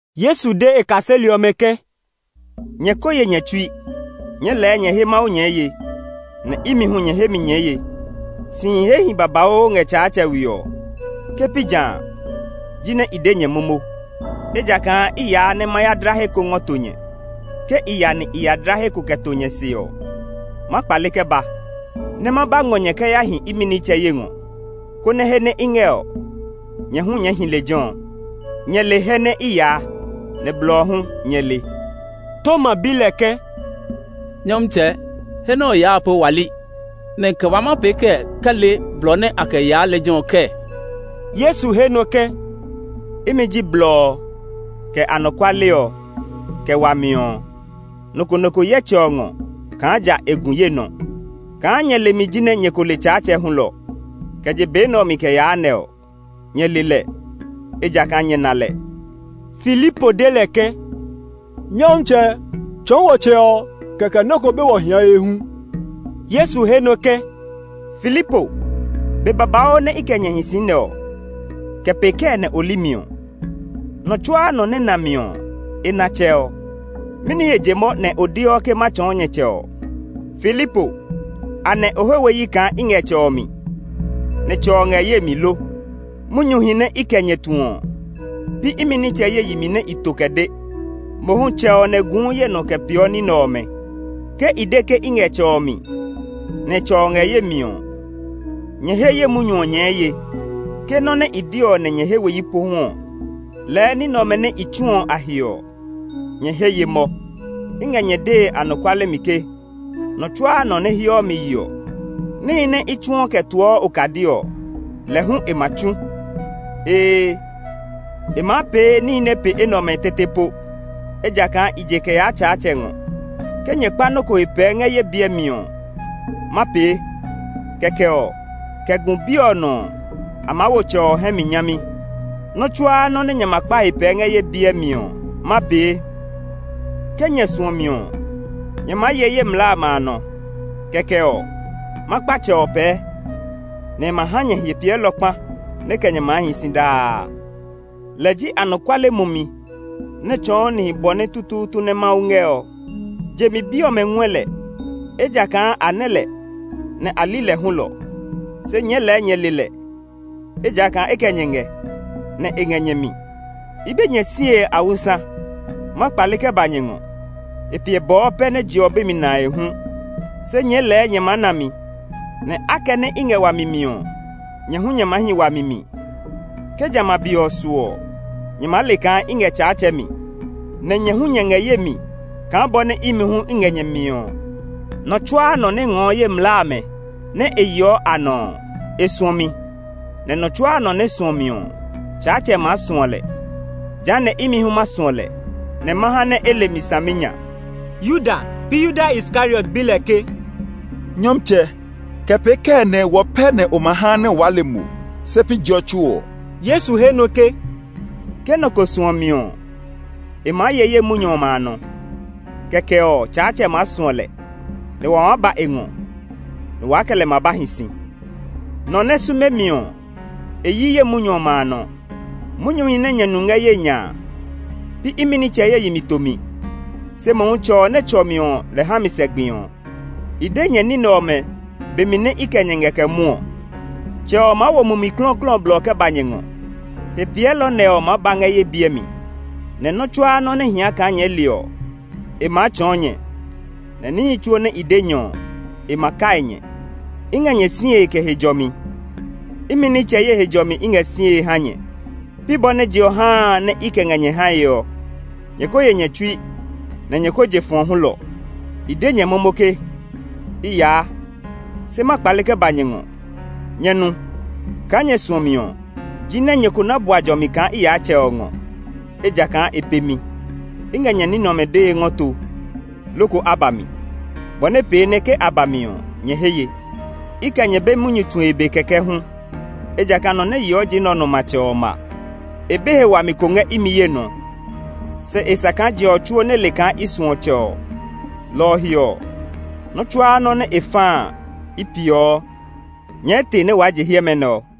Yesu de e kaseli ɔmɛ ke, “Nyɛ ko ye nyɛ tsui. Nyɛɛ lɛɛ nyɛ he Mawu nyɛɛ ye; nɛ imi hu nyɛ he mi nyɛɛ ye. Sihi hehi babauu ngɛ Tsaatsɛ we ɔ; ke pi ja a, jinɛ i de nyɛ momo, ejakaa i yaa nɛ ma ya dla he ko ngɔ to nyɛ. Ke i ya nɛ i ya dla he ko kɛ to nyɛ se ɔ, ma kpale kɛ ba, nɛ ma ba ngɔ nyɛ kɛ ya hi imi nitsɛ ye ngɔ. Kɛkɛ ɔ, he nɛ i ngɛ ɔ, nyɛ hu nyɛɛ maa hi lejɛ ɔ. Nyɛ le he nɛ i yaa, nɛ blɔ ɔ hu nyɛ le.” Toma bi lɛ ke, “Nyɔmtsɛ, he nɛ o yaa a po wa li, nɛ kɛ wa maa pee kɛ le blɔ ɔ nɛ a kɛ yaa lejɛ ɔ kɛɛ?” Yesu he nɔ ke, “Imi ji blɔ ɔ, imi ji anɔkuale ɔ, nɛ imi ji wami ɔ hulɔ. Nɔ ko nɔ ko yɛ Tsɛ ɔ ngɔ kaa ja e gu ye nɔ. Kaa nyɛ le mi jinɛ nyɛ ko le Tsaatsɛ hulɔ. Kɛ je be nɛ ɔ mi kɛ yaa nɛ ɔ, nyɛ le lɛ, ejakaa nyɛ na lɛ.” Filipo de lɛ ke, “Nyɔmtsɛ, tsɔɔ wɔ Tsɛ ɔ, kɛkɛ nɔ ko be wɔ hiae hu.” Yesu he nɔ ke, “Filipo, be babauu nɛ i kɛ nyɛ hi si nɛ ɔ, kɛ pee kɛɛ nɛ o li mi ɔ? Nɔ tsuaa nɔ nɛ na mi ɔ, e na Tsɛ ɔ. Mɛni he je mɔ nɛ o deɔ ke ma tsɔɔ nyɛ Tsɛ ɔ? Filipo, anɛ o he we yi kaa i ngɛ Tsɛ ɔ mi, nɛ Tsɛ ɔ ngɛ ye mi lo? Munyuhi nɛ i kɛ nyɛ tu ɔ, pi imi nitsɛ ye yi mi nɛ i to kɛ de. Mohu Tsɛ ɔ nɛ guu ye nɔ kɛ peeɔ ní nɛ ɔmɛ. Ke i de ke i ngɛ Tsɛ ɔ mi, nɛ Tsɛ ɔ ngɛ ye mi ɔ, nyɛ he ye munyu ɔ nyɛɛ ye. Ke nɔ́ nɛ i de ɔ nɛ nyɛ he we yi pohu ɔ, lɛɛ ní nɛ ɔmɛ nɛ i tsu ɔ a he ɔ, nyɛ he ye mɔ. I ngɛ nyɛ dee anɔkuale mi ke, nɔ tsuaa nɔ nɛ heɔ mi yeɔ ɔ, níhi nɛ i tsuɔ kɛ toɔ okadi ɔ, lɛ hu e ma tsu. Ee, e maa pee níhi nɛ pe enɛ ɔmɛ tete po, ejakaa i je kɛ yaa Tsaatsɛ ngɔ. Ke nyɛ kpa nɔ́ ko he pɛɛ ngɛ ye biɛ mi ɔ, ma pee; kɛkɛ ɔ, kɛ gu Bi ɔ nɔ ɔ, a maa wo Tsɛ ɔ hɛ mi nyami. Nɔ́ tsuaa nɔ́ nɛ nyɛ ma kpa he pɛɛ ngɛ ye biɛ mi ɔ, ma pee. “Ke nyɛ suɔ mi ɔ, nyɛ maa ye ye mlaa amɛ a nɔ. Kɛkɛ ɔ, ma kpa Tsɛ ɔ pɛɛ, nɛ e ma ha nyɛ Hepiɛlɔ kpa nɛ kɛ nyɛ maa hi si daa. Lɛ ji anɔkuale mumi nɛ tsɔɔ nihi bɔ nɛ tutuutu nɛ Mawu ngɛ ɔ. Je mi bi ɔmɛ ngɔɛ lɛ, ejakaa a nɛ́ lɛ, nɛ a li lɛ hulɔ. Se nyɛɛ lɛ nyɛ le lɛ, ejakaa e kɛ nyɛ ngɛ, nɛ e ngɛ nyɛ mi. “I be nyɛ sie awusa; ma kpale kɛ ba nyɛ ngɔ. E piɛ bɔɔ pɛ nɛ je ɔ be mi nae hu; se nyɛɛ lɛɛ nyɛ maa na mi. Nɛ akɛnɛ i ngɛ wami mi ɔ, nyɛ hu nyɛ maa hi wami mi. Ke jamɛ a be ɔ su ɔ, nyɛ maa le kaa i ngɛ Tsaatsɛ mi, nɛ nyɛ hu nyɛ ngɛ ye mi kaa bɔ nɛ imi hu i ngɛ nyɛ mi ɔ. “Nɔ tsuaa nɔ nɛ ngɔɔ ye mlaa amɛ nɛ e yeɔ a nɔ ɔ, e suɔ mi; nɛ nɔ tsuaa nɔ nɛ suɔ mi ɔ, Tsaatsɛ maa suɔ lɛ. Jehanɛ imi hu ma suɔ lɛ, nɛ ma ha nɛ e le mi saminya.” Yuda (pi Yuda Iskariot) bi lɛ ke, “Nyɔmtsɛ, kɛ pee kɛɛ nɛ wɔ pɛ nɛ o ma ha nɛ waa le mo, se pi je ɔ tsuo ɔ?” Yesu he nɔ ke, “Ke nɔ ko suɔ mi ɔ, e maa ye ye munyu ɔmɛ a nɔ. Kɛkɛ ɔ, Tsaatsɛ maa suɔ lɛ, nɛ wa maa ba e ngɔ, nɛ waa kɛ lɛ ma ba hi si. Nɔ nɛ sume mi ɔ, e yi ye munyu ɔmɛ a nɔ. Munyuhi nɛ nyɛ nu ngɛ ye nya a, pi imi nitsɛ ye yi mi tomi, se mohu Tsɛ ɔ nɛ tsɔ mi ɔ lɛ ha mi sɛ gbi ɔ. “I de nyɛ ní nɛ ɔmɛ be mi nɛ i kɛ nyɛ ngɛ kɛ mwɔɔ ɔ. Tsɛ ɔ maa wo Mumi Klɔuklɔu ɔ blɔ kɛ ba nyɛ ngɔ. Hepiɛlɔ nɛ ɔ maa ba ngɛ ye biɛ mi, nɛ nɔ́ tsuaa nɔ́ nɛ hia kaa nyɛɛ le ɔ, e maa tsɔɔ nyɛ; nɛ nihi tsuo nɛ i de nyɛ ɔ, e ma kai nyɛ. “I ngɛ nyɛ sie kɛ he jɔmi. Imi nitsɛ ye he jɔmi i ngɛ sie ha nyɛ. Pi bɔ nɛ je ɔ haa a nɛ i kɛ ngɛ nyɛ hae ɔ. Nyɛ ko ye nyɛ tsui; nɛ nyɛ ko je fɔ̃ hulɔ. I de nyɛ momo ke, ‘I yaa, se ma kpale kɛ ba nyɛ ngɔ.’ Nyɛ nu! Kaa nyɛ suɔ mi ɔ, jinɛ nyɛ ko na bua jɔmi kaa i yaa Tsɛ ɔ ngɔ, ejakaa e pe mi. I ngɛ nyɛ ní nɛ ɔmɛ dee ngɔ to loko a ba mi, bɔ nɛ pee nɛ ke a ba mi ɔ, nyɛ he ye. I kɛ nyɛ be munyu tue be kɛkɛ hu, ejakaa nɔ nɛ yeɔ je nɛ ɔ nɔ matsɛ ɔ ma. E be he wami ko ngɛ imi ye nɔ; se e sa kaa je ɔ tsuo nɛ le kaa i suɔ Tsɛ ɔ, lɔ ɔ he ɔ, nɔ́ tsuaa nɔ́ nɛ e fa a, i peeɔ. “Nyɛɛ te nɛ waa je hiɛmɛ nɛ ɔ!